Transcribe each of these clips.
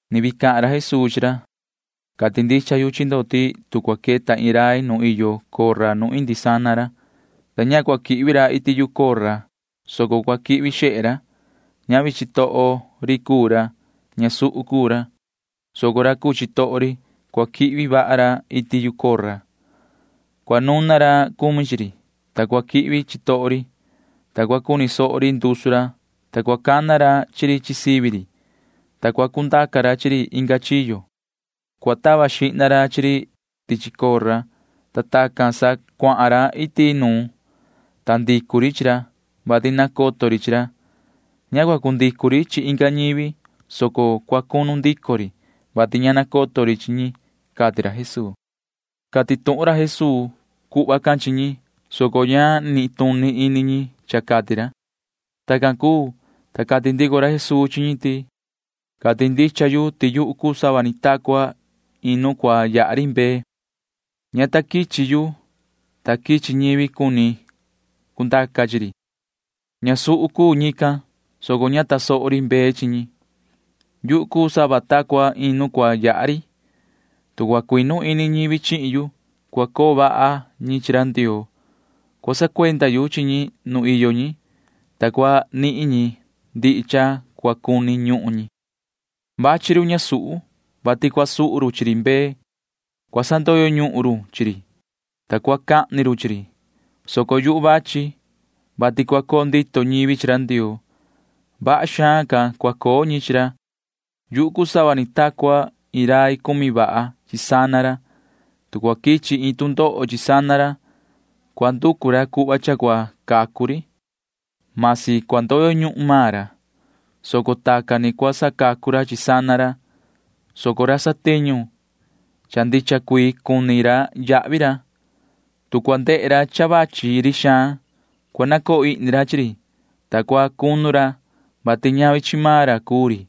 [Ni vii cahan ra Jesuu chi ra:] ’Cati ndicha yu chi ndo ti tu cua queta iin rai nu iyo cora nu indi sana ndo, ta ña cua quihvi ra iti chiyo yu cora, soco cua quihvi xehe ra, ñavi chitoho ri cuu ra. Ñasuhu cuu ra, soco ra cuu chitoho ri―cua quihvi vaha ra iti yu cora. Cua nuna ra cumi chi ri, ta cua quihvi chitoho ri, ta cua cuni soho ri ndusu ra, ta cua cana ra sivi ri, ta cua cundaca ra chi ri inga chiyo. Cua tava xihna ra chi ri tichi cora, ta tacan sa cuahan ra iti nuun, ta ndicu ri chi ra, vati nacoto ri chi ra. Ña cua cundicu ri chi inga ñivi, soco cua cunu ndico ri, vati ña nacoto ri chi ñi ―cati ra Jesuu. Cati tuhun ra Jesuu cuhva can chi ñi, soco ña nituni ini ñi cha cati ra. Tacan cuu, ta cati ndico ra Jesuu chi ñi ti: ―Cati ndicha yu ti yuhu cuu sava ni ta cua iin nu cua yaha ri mbee. Ña ta quichi yu, ta quichi ñivi cuni cundaca chi ri. Ñasuhu cuu ñican, soco ña tasoho ri mbee chi ñi. Yuhu cuu sava ta cua iin nu cua yaha ri. Tu cua cuinu ini ñivi chihin yu, cua coo vaha ñi chi ra Ndioo. Cua sacuenda yu chi ñi nu iyo ñi, ta cua nihin ñi ndihi cha cua cuni ñuhun ñi. ’Vachi run ñasuhu, vati cua suhu run chi ri mbee. Cua sandoyo ñuhun run chi ri, ta cua cahni run chi ri, soco yuhu vachi, vati cua coo ndito ñivi chi ra Ndioo. Vaha xaan ca cua coo ñi chi ra cuni yu. Yuhu cuu sava ni ta cua iin rai cumi vaha chi sana ra. [Tu cua quichi iin tu ndoho chi sana ra, cua nducu ra cuhva cha cua cacu ri.] Masi cua ndoyo ñuhun maan ra, soco tacan ni cua sacacu ra chi sana ra. Tu ra musu cuu ra, ta ndehe ra ti vachi ri xaan, cua nacoo ihni ra chi ri, ta cua cunu ra, vati ñavi chi maan ra cuu ri.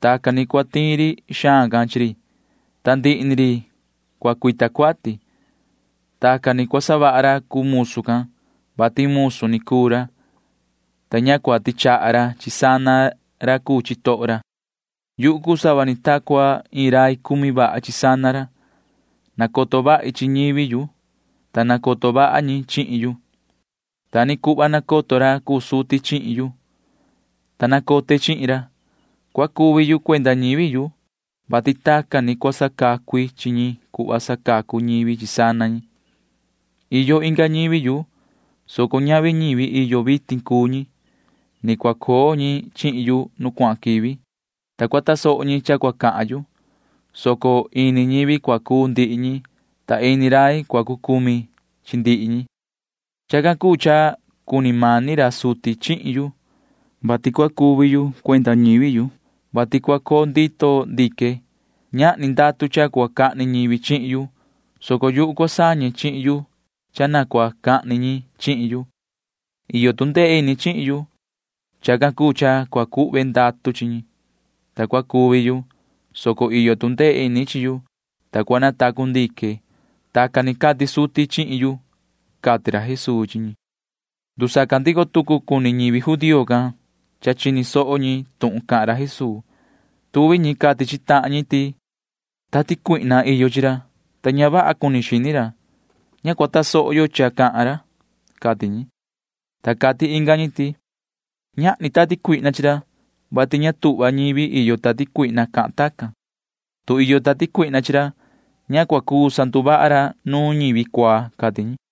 Tacan ni cua tiin ri xaan can chi ri, ta ndihi ni ri cua cuita cuati. Tacan ni cua savaha ra cuu musu can, vati musu ni cuu ra, ta ña cua tichaha ra chi sana ra cuu chitoho ra. ’Yuhu cuu sava ni ta cua iin rai cumi vaha chi sana ra. Nacoto vahi chi ñivi yu, ta nacoto vaha ñi chihin yu. Ta ni cuhva nacoto ra cuu suti chihin yu, ta nacote chihin ra. Cua cuvi yu cuenda ñivi yu, [vati tacan ni cua sacacu i chi ñi cuhva sacacu ñivi chi sana ñi]. Ni iyo inga ñivi yu, soco ñavi ñivi iyo vitin cuu ñi. Ni cua coo ñi chihin yu nu cuahan quivi, ta cua tasoho ñi cha cua cahan yu, soco ini ñivi cua cuu ndihi ñi, ta ini rai cua cucumi chi ndihi ñi. ’Chacan cuu cha cuni mani ra suti chihin yu, vati cua cuvi yu cuenda ñivi yu. Cua cuvi yu, vati cua coo ndito ndique. Ñahni ndatu cha cua cahni ñivi chihin yu, soco yuhu cua sañe chihin yu cha na cua cahni ñi chihin yu. Iyo tu ndee ini chihin yu. Chacan cuu cha cua cuhve ndatu chi ñi, ta cua cuvi yu, soco iyo tu ndee ini chi yu, ta cua natacu ndique. Tacan ni cati suti chihin yu ―cati ra Jesuu chi ñi. Ndusaca ndico tucu cuni ñivi judío can, ta chini soho ñi tuhun cahan ra Jesuu. Tuvi ñi cati chi tahan ñi ti: ―Iyo cuihna chi ra, ta ña vaha cuni xini ra. Ña cua tasoho yo cha cahan ra ―cati ñi. Ta cati inga ñi ti: ―Ñahni cuihna chi ra, vati ña tuhva ñivi iyo cuihna cahan ñi tacan. Tu iyo cuihna chi ra, ña cua cuu sanduvaha ra nuun ñi cuaa ―cati ñi.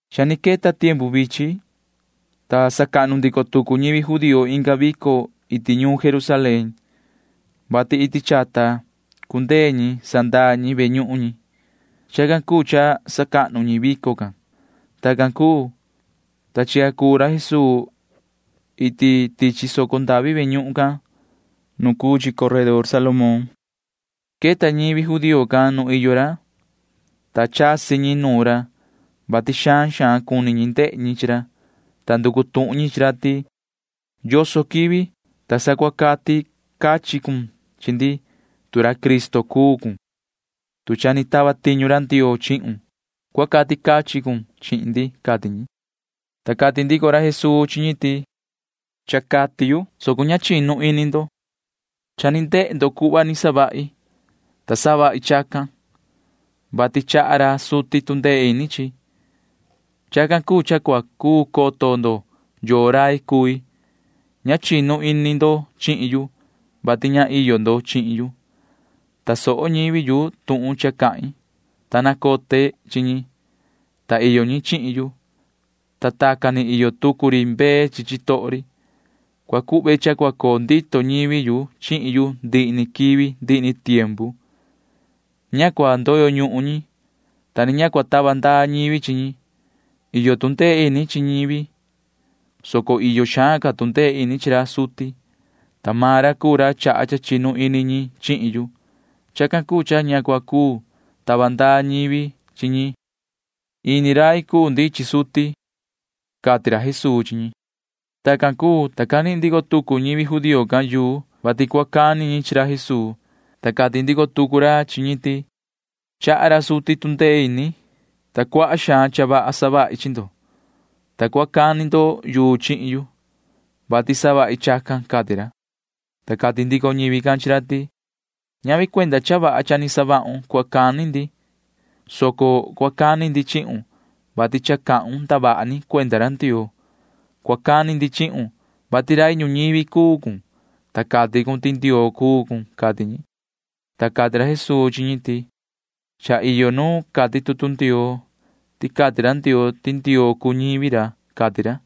Cha ni queta tiempu vichin, ta sacahnu ndico tucu ñivi judío inga vico iti ñuun Jerusalén, vati iti chata cundee ñi sandaa ñi ve ñuhun cahnu ñi. Chacan cuu cha sacahnu ñi vico can. Tacan cuu, ta chica cuu ra Jesuu iti tichi soco ndavi ve ñuhun can nu cuu chi coredor Salomón. Queta ñivi judío can nu iyo ra, ta chasi ñi nuun ra, vati xaan xaan cuni ñi ndehe ñi chi ra, ta nducu tuhun ñi chi ra ti: ―¿Yoso quivi, ta sa cua cati cachin cun chi ndi? Tu ra Cristo cuun, [tu cha ni tava tiñu ra Ndioo chihun,] cua cati cachin cun chi ndi ―cati ñi. Ta cati ndico ra Jesuu chi ñi ti: ―Cha ni cati yu, soco ña chinu ini ndo. Cha ni ndehe ndo cuhva ni savahi, ta savahi chacan, vati chaha ra suti tu ndee ini chihin yu. Chacan cuu cha cua cuu coto ndo yoo rai cui. Ña chinu ini ndo chihin yu, vati ña iyo ndo chihin yu. Tasoho ñivi yu tuhun cha cahin, ta nacote chi ñi, ta iyo ñi chihin yu, ta tacan ni iyo tucu ri mbee chi chitoho ri. Cua cuhve cha cua coo ndito ñivi yu chihin yu ndihi ni quivi ndihi ni tiempu. Ña cua ndoyo ñuhun ñi, ta ni ña cua tava ndaa ñivi chi ñi. Iyo tu ndee ini chi ñivi, soco iyo xaan ca tu ndee ini chi ra suti, ta maan ra cuu ra chaha cha chinu ini ñi chihin yu. Chacan cuu cha ña cua cuu tava ndaa ñivi chi ñi. Ini rai cuu ndi chi suti ―cati ra Jesuu chi ñi. Tacan cuu, ta canihin ndico tucu ñivi judío can yuu, vati cua cani ñi chi ra Jesuu, ta cati ndico tucu ra chi ñi ti: ―Chaha ra suti tu ndee ini, ta cuaha xaan cha vaha savahi chi ndo. Vasi cua cani ndo yuu chihin yu, vati savahi chacan ―cati ra. Ta cati ndico ñivi can chi ra ti: ―Ñavi cuenda cha vaha cha ni savahun cua cani ndi, soco cua cani ndi chihun, vati cha cahun ndavaha ni cuenda ra Ndioo. Cua cani ndi chihun, vati rai ñuñivi cuu cun, ta cati cun ti Ndioo cuu cun ―cati ñi. Ta cati ra Jesuu chi ñi ti: ―Cha iyo nu cati tutu Ndioo ti cati ra Ndioo ti ndioo cuu ñivi ra, cati ra.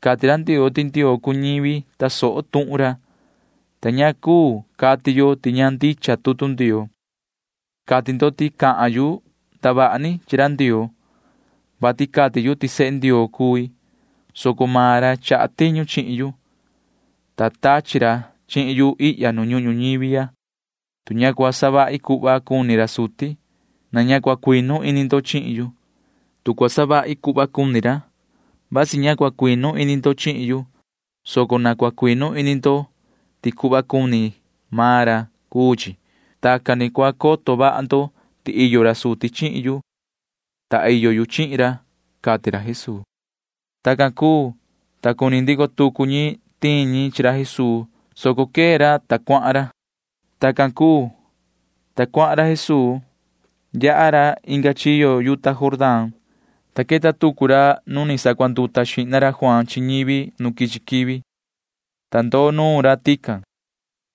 Cati ra Ndioo ti ndioo cuu ñivi tasoho tuhun ra, ta ña cuu cati yo ti ña ndicha tutu Ndioo. Cati ndo ti cahan yu ndavaha ni chi ra Ndioo, vati cati yu ti sehe Ndioo cui, soco maan ra chaha tiñu chihin yu, ta tachi ra chihin yu ihya nu ñuhun ñuñivi ya. Tu ña cua savahi cuhva cuni ra suti, na ña cua cuinu ini ndo chihin yu. Tu cua savahi cuhva cuni ra, vasi ña cua cuinu ini ndo chihin yu, soco na cua cuinu ini ndo ti cuhva cuni maan ra cuu chi. Tacan ni cua coto vaha ndo ti iyo ra suti chihin yu, ta iyo yu chihin ra ―cati ra Jesuu. Tacan cuu, ta cuni ndico tucu ñi tiin ñi chi ra Jesuu, soco quee ra cuahan ra. Tacan cuu, ta cuahan ra Jesuu. Yaha ra inga chiyo yuta Jordán, ta queta tucu ra nu ni sacuanduta xihna ra Juaan chi ñivi nu quichi quivi, ta ndoo nuun ra tican.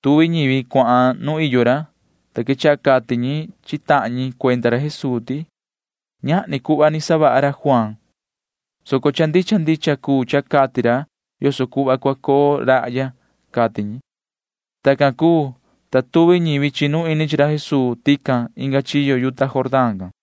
Tuvi ñivi cuahan nu iyo ra, ta quechaha cati ñi chi tahan ñi cuenda ra Jesuu ti: ―Ñahni cuhva ni savaha ra Juaan, soco cha ndicha ndicha cuu cha cati ra yoso cuhva cua coo rahya ―cati ñi. Tacan cuu, ta tuvi ñivi chinu ini chi ra Jesuu tican inga chiyo yuta Jordán can.